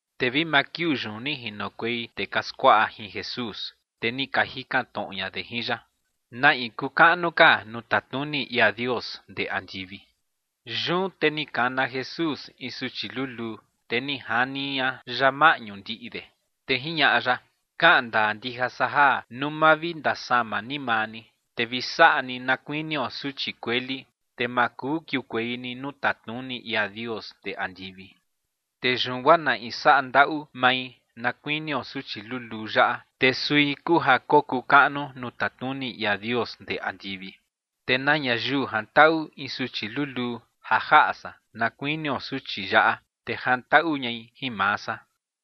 Te vi maa kiuu yun ni jinokuei tee ka skuaꞌa jin Jesús, te ni ka jikan tnoꞌo ña de jin ya: ͏―͏¿Na in kuu kaꞌnu ka nuu tatnuni ia Dios ndee andivi? Yun te ni kana Jesús in suchi luluu, te ni jani ña ya maꞌñu ndiꞌi de. Te jiñaꞌa ya: ͏―͏Kaꞌan ndaa ndija san ja nuu ma vi ndasama ni maa ni, te vi saꞌa ni na kuinio suchi kueli, te ma kuu kiukuei ni nuu tatnuni ia Dios ndee andivi. Te yun guaa na in saꞌa ndaꞌu mai na kuinio suchi luluu yaꞌa, te sui kuu ja kokuu kaꞌnu nuu tatnuni ia Dios ndee andivi. Te na ñayiu jantaꞌu in suchi luluu ja jaꞌa san na kuinio suchi yaꞌa, te jantaꞌu ñai jin maa san.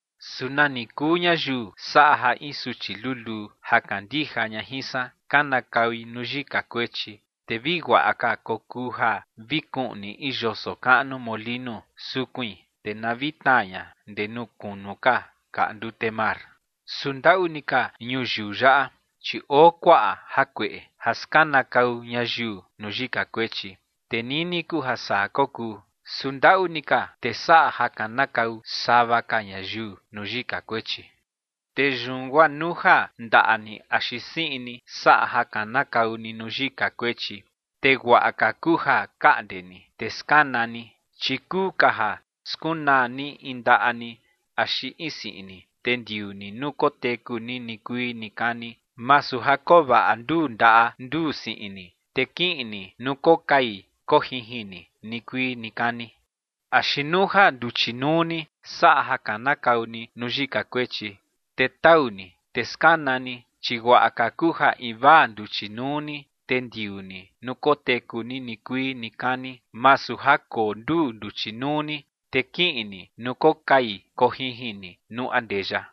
’Su nani kuu ñayiu saꞌa ja in suchi luluu ja kandija ña jin san, kanakaui nuu yika kuechi, te vi guaꞌa ka kokuu ja vi kuꞌni in yoso kaꞌnu molinu sukuin, te na vi tnaa ña ndee nuu kunu ka kaꞌa ndute mar. Su ndaꞌu ni ka ñuyiu yaꞌa, chi oo kuaꞌa jakueꞌe ja skanakau ñayiu nuu yika kuechi. Te nini kuu ja saa kokuu. Su ndaꞌu ni ka tee saꞌa ja kanakau sava ka ñayiu nuu yika kuechi. ’Te yun guaa nuu ja ndaꞌa ni axi siꞌin ni saꞌa ja kanakau ni nuu yika kuechi, te guaꞌa ka kuu ja kaꞌnde ni te skana ni, chi kuu ka ja skunaa ni in ndaꞌa ni axi in siꞌin ni, te ndiuu ni nuu koteku ni nikuii nikani, masu ja koo vaꞌa nduu ndaꞌa nduu siꞌin ni, te kiꞌin ni nuu kokai kojinjin ni nikuii nikani. Axi nuu ja nduchi nuu ni saꞌa ja kanakau ni nuu yika kuechi, te tau ni, te skana ni. Chi guaꞌa ka kuu ja invaa nduchi nuu ni te ndiuu ni nuu koteku ni nikuii nikani, masu ja koo nduu nduchi nuu ni, te kiꞌin ni nuu kokai kojinjin ni nuu andeya.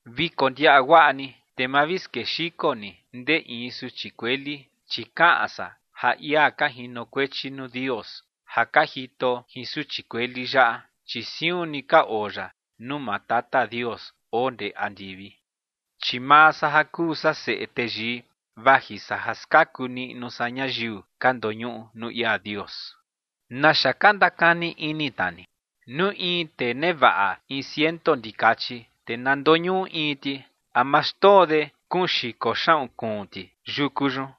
’Vi kondiaꞌa guaꞌa ni, te ma vi skexiko ni ndee in suchi kueli, chi kaꞌan san ja ia ka jinokuechi nuu Dios ja ka jito jin suchi kueli yaꞌa, chi siun ni ka oo ya nuu maa Tata Dios oo ndee andivi. Chi maa san ja kuu san Seꞌe Teyii, vaji san ja skaku niꞌnu san ñayiu ka ndoñuꞌu nuu ia Dios. ’¿Naxa ka ndakani ini tna ni? Nuu in tee nevaꞌa in ciento ndikachi, te na ndoñuꞌu in ti, ¿a ma xndoo de kuun xiko xaꞌun kuun ti yuku yun,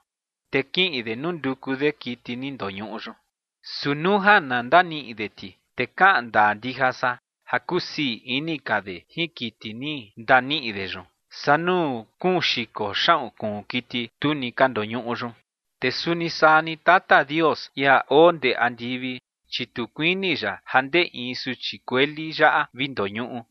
te kiꞌin de nunduku de kiti ni ndoñuꞌu yun? Su nuu ja na ndaniꞌi de ti, te kaꞌan ndaa ndija san ja kusii ini ka de jin kiti ni ndaniꞌi de yun, saa nuu kuun xiko xaꞌun kuun kiti tu ni ka ndoñuꞌu yun. Te suni saa ni Tata Dios, ia oo ndee andivi, chi tu kuini ya ja ndee in suchi kueli yaꞌa vi ndoñuꞌu.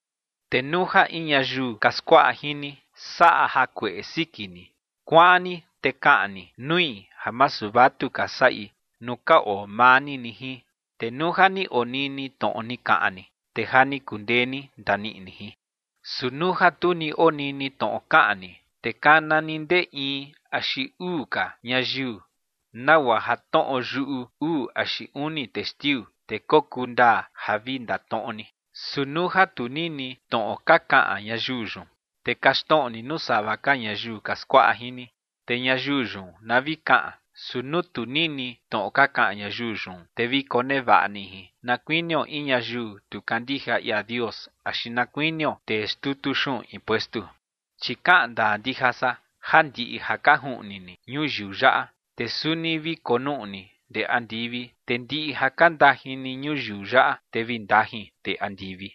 ’Te nuu ja in ñayiu ka skuaꞌa jin ni saꞌa jakueꞌe siki ni, kuaꞌan ni, te kaꞌan ni nui ja masu vatuka saꞌi nuu ka oo maa ni ni jin. Te nuu ja ni onini tnoꞌo ni kaꞌan ni, te ja ni kundee ni ndaniꞌi ni jin. Su nuu ja tu ni onini tnoꞌo kaꞌan ni, te kana ni ndee in axi uu ka ñayiu nagua ja tnoꞌo yuꞌu uu axi uni testiu, te kokuu ndaa ja vi ndatnoꞌo ni. Su nuu ja tu nini tnoꞌo ka kaꞌan ñayiu yun, te kaxtnoꞌo ni nuu sava ka ñayiu ka skuaꞌa jin ni, te ñayiu yun na vi kaꞌan. Su nuu tu nini tnoꞌo ka kaꞌan ñayiu yun, te vi konevaꞌa ni jin na kuinio in ñayiu tu kandija ia Dios axi na kuinio tee xtutu xuꞌun impuestu. ’Chi kaꞌan ndaa ndija san ja ndiꞌi ja ka juꞌni ni ñuyiu yaꞌa, te suni vi konuꞌni ndee andivi, te ndiꞌi ja ka ndajin ni ñuyiu yaꞌa, te vi ndajin ndee andivi.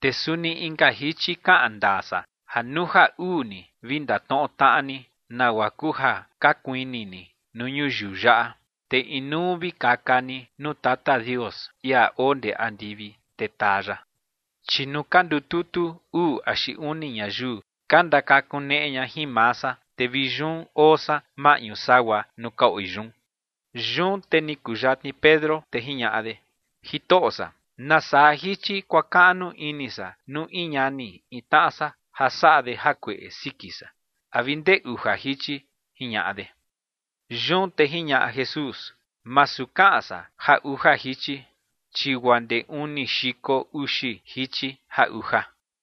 ’Te suni inka jichi kaꞌan ndaa san ja nuu ja uu ni vi ndatnoꞌo tnaꞌa ni nagua kuu ja ka kuini ni nuu ñuyiu yaꞌa, te inuu vi kakan ni nuu Tata Dios, ia oo ndee andivi, te taa ya. Chi nuu ka ndututu uu axi uni ñayiu ka ndakakuneꞌe ña jin maa san, te vi yun oo san maꞌñu sagua nuu ka oi yun. Yun te ni kuyatni Pedro, te jiñaꞌa de: ͏―͏Jitoꞌo san, ¿nasaa jichi kuakaꞌnu ini san nuu in ñani in tnaꞌa san ja saꞌa de jakueꞌe siki san? ¿A vi ndee uja jichi? ͏―͏jiñaꞌa de. Yun te jiñaꞌa Jesús: ͏―͏Masu kaꞌan san ja uja jichi, chi guaa ndee uni xiko uxi jichi ja uja.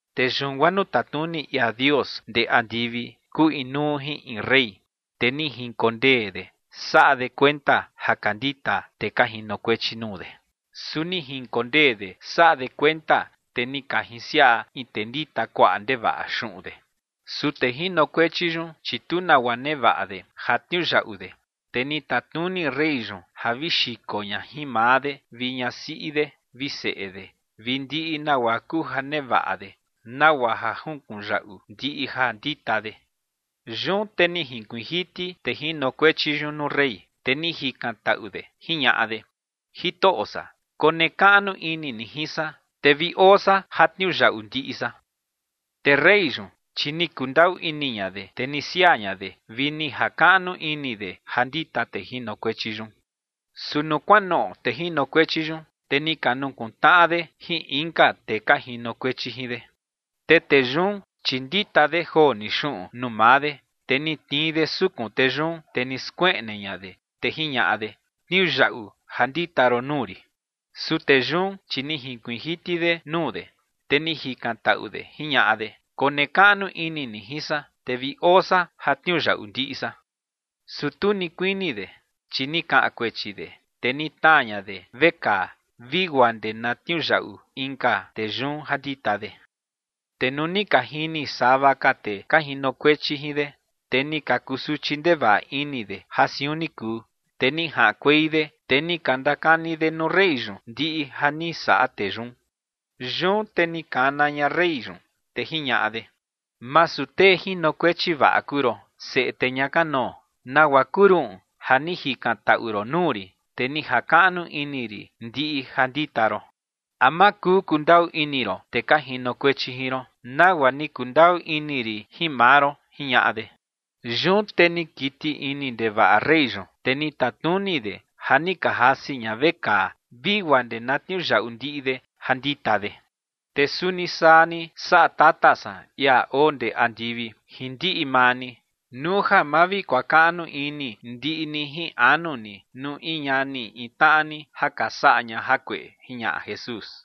’Te yun guaa nuu tatnuni ia Dios ndee andivi kuu inuu jin in rey. Te ni jinkondee de saꞌa de kuenta ja ka ndita tee ka jinokuechi nuu de. Su ni jinkondee de saꞌa de kuenta, te ni ka jinsiaꞌa in tee ndita kuaꞌa ndevaꞌa xuꞌun de. Su tee jinokuechi yun, chi tu nagua nevaꞌa de ja tniuyaꞌu de, te ni tatnuni rey yun ja vi xiko ña jin maa de vi ñasiꞌi de vi seꞌe de vi ndiꞌi nagua kuu ja nevaꞌa de, nagua ja junkunyaꞌu ndiꞌi ja ndita de. Yun te ni jinkuiin jiti tee jinokuechi yun nuu rey, te ni jikantaꞌu de jiñaꞌa de: “Jitoꞌo san, konekaꞌnu ini ni jin san, te vi oo san ja tniuyaꞌu ndiꞌi san”. Te rey yun, chi ni kundaꞌu ini ña de, te ni siaa ña de vi ni jakaꞌnu ini de ja ndita tee jinokuechi yun. Su nuu kuanoꞌo tee jinokuechi yun, te ni ka nukuntnaꞌa de jin inka tee ka jinokuechi jin de. Te tee yun, chi ndita de joo ni xuꞌun nuu maa de, te ni tnii de sukun tee yun, te ni skueꞌne ña de, te jiñaꞌa de: “Tniuyaꞌu ja ndita ron nuu rin”. ’Su tee yun, chi ni jinkuiin jiti de nuu de, te ni jikantaꞌu de jiñaꞌa de: “Konekaꞌnu ini ni jin san, te vi oo san ja tniuyaꞌu ndiꞌi san”. Su tu ni kuini de, chi ni kaꞌan kuechi de, te ni tnaa ña de vekaa vi guaa ndee na tniuyaꞌu inka tee yun ja ndita de. Te nuu ni ka jini sava ka tee ka jinokuechi jin de, te ni ka kusuchi ndevaꞌa ini de ja siun ni kuu, te ni jaꞌankuei de, te ni ka ndakani de nuu rey yun ndiꞌi ja ni saꞌa tee yun. Yun te ni kana ña rey yun, te jiñaꞌa de: “Masu tee jinokuechi vaꞌa kuu ron, seꞌe tee ña kanoo. ¿Nagua kuu ruꞌun ja ni jikantaꞌu ron nuu rin, te ni jakaꞌnu ini rin ndiꞌi ja ndita ron? ¿A ma kuu kundaꞌu ini ron tee ka jinokuechi jin ron, nagua ni kundaꞌu ini rin jin maa ron?”, jiñaꞌa de. Yun te ni kiti ini ndevaꞌa rey yun, te ni tatnuni de ja ni ka jasi ña vekaa vi guaa ndee na tniuyaꞌu ndiꞌi de ja ndita de. ’Te suni saa ni saꞌa Tata san, ia oo ndee andivi, jin ndiꞌi maa ni nuu ja ma vi kuakaꞌnu ini ndiꞌi ni jin anu ni nuu in ñani in tnaꞌa ni ja ka saꞌa ña jakueꞌe ͏―͏jiñaꞌa Jesús.